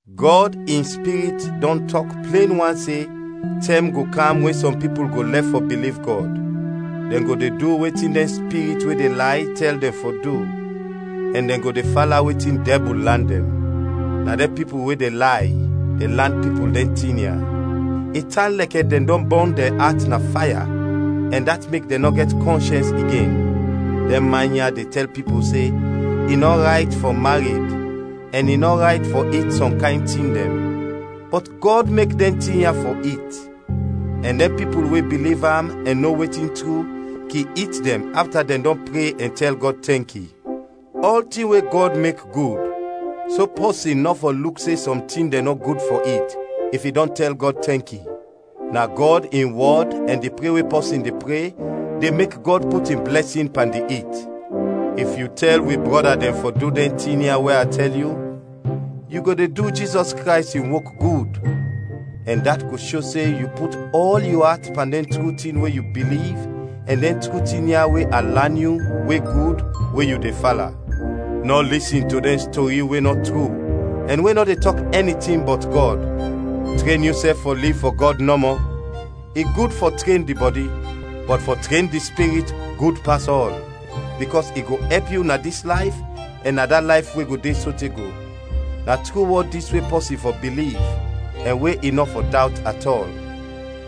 Gɔd in Spirit dɔn tɔk plen wan se tɛm go kam we sɔm pipul go lɛf fɔ biliv Gɔd; dɛn go de du wetin dɛn spirit we de lay tɛl dɛn fɔ du, ɛn dɛn go de fala wetin dɛbul lan dɛn. Na dɛn pipul we de lay, de lan pipul dɛn tin ya i tan lɛkɛ dɛn dɔn bɔn dɛn at na faya ɛn dat mek dɛn nɔ gɛt kɔnshɛns igen. Dɛn man ya de tɛl pipul se i nɔ rayt fɔ mared ɛn i nɔ rayt fɔ it sɔm kayn tin dɛn. Bɔt Gɔd mek dɛn tin ya fɔ it, ɛn dɛn pipul we biliv am ɛn no wetin tru, kin it dɛn afta dɛn dɔn pre ɛn tɛl Gɔd tɛnki. Ɔltin we Gɔd mek gud, so pɔsin nɔ fɔ luk se sɔm tin dɛn nɔ gud fɔ it, if i dɔn tɛl Gɔd tɛnki. Na Gɔd in wɔd ɛn di pre we pɔsin de pre de mek Gɔd put in blɛsin pan di it. If yu tɛl wi brɔda dɛn fɔ du dɛn tin ya we a tɛl yu, yu go de du Jizɔs Krays in wok gud, ɛn dat go sho se yu put ɔl yu at pan dɛn tru tin we yu biliv ɛn dɛn tru tin ya we a lan yu, we gud, we yu de fala. Nɔ lisin to dɛn stori we nɔ tru ɛn we nɔ de tɔk ɛni tin bɔt Gɔd. Tren yusɛf fɔ liv fɔ Gɔd nɔmɔ. I gud fɔ tren di bɔdi, bɔt fɔ tren di spirit gud pas ɔl, bikɔs i go ɛp yu na dis layf ɛn na da layf we go de sote go. Na tru wɔd dis we pɔsin fɔ biliv ɛn we i nɔ fɔ dawt at ɔl.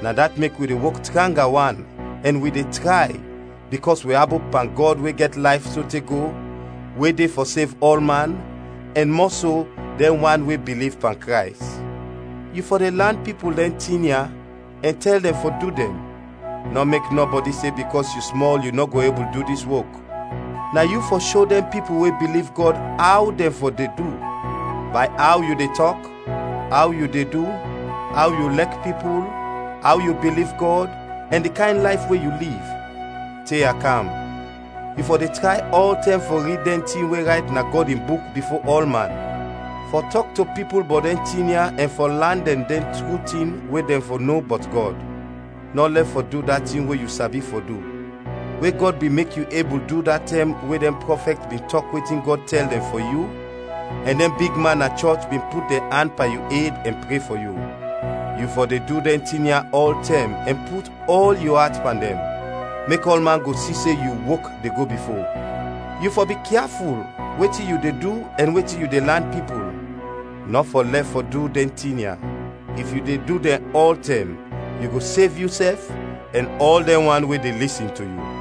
Na dat mek wi de wok tranga wan ɛn wi de tray, bikɔs wi abop pan Gɔd we gɛt layf sote go, we de fɔ sev ɔlman, ɛn mɔso, dɛn wan we biliv pan Krays. Yu fɔ de lan pipul dɛn tin ya ɛn tɛl dɛn fɔ du dɛn. Nɔ mek nɔbɔdi se bikɔs yu smɔl yu nɔ go ebul du dis wok. Na yu fɔ sho dɛn pipul we biliv Gɔd aw dɛn fɔ de du bay aw yu de tɔk, aw yu de du, aw yu lɛk pipul, aw yu biliv Gɔd, ɛn di kayn layf we yu liv. Te a kam, yu fɔ de tray ɔltɛm fɔ rid dɛn tin we rayt na Gɔd in Buk bifo ɔlman, fɔ tɔk to pipul bɔt dɛn tin ya ɛn fɔ lan dɛn dɛn tru tin we dɛn fɔ no bɔt Gɔd. Nɔ lɛf fɔ du da tin we yu sabi fɔ du, we Gɔd bin mek yu ebul du da tɛm we dɛn prɔfɛt bin tɔk wetin Gɔd tɛl dɛn fɔ yu, ɛn dɛn bigman na chɔch bin put dɛn an pan yu ed ɛn pre fɔ yu. Yu fɔ de du dɛn tin ya ɔltɛm ɛn put ɔl yu at pan dɛn, mek ɔlman go si se yu wok de go bifo. Yu fɔ bikyaful wetin yu de du ɛn wetin yu de lan pipul. Nɔ fɔ lɛf fɔ du dɛn tin ya; if yu de du dɛn ɔltɛm yu go sev yusɛf ɛn ɔl dɛn wan we de lisin to yu.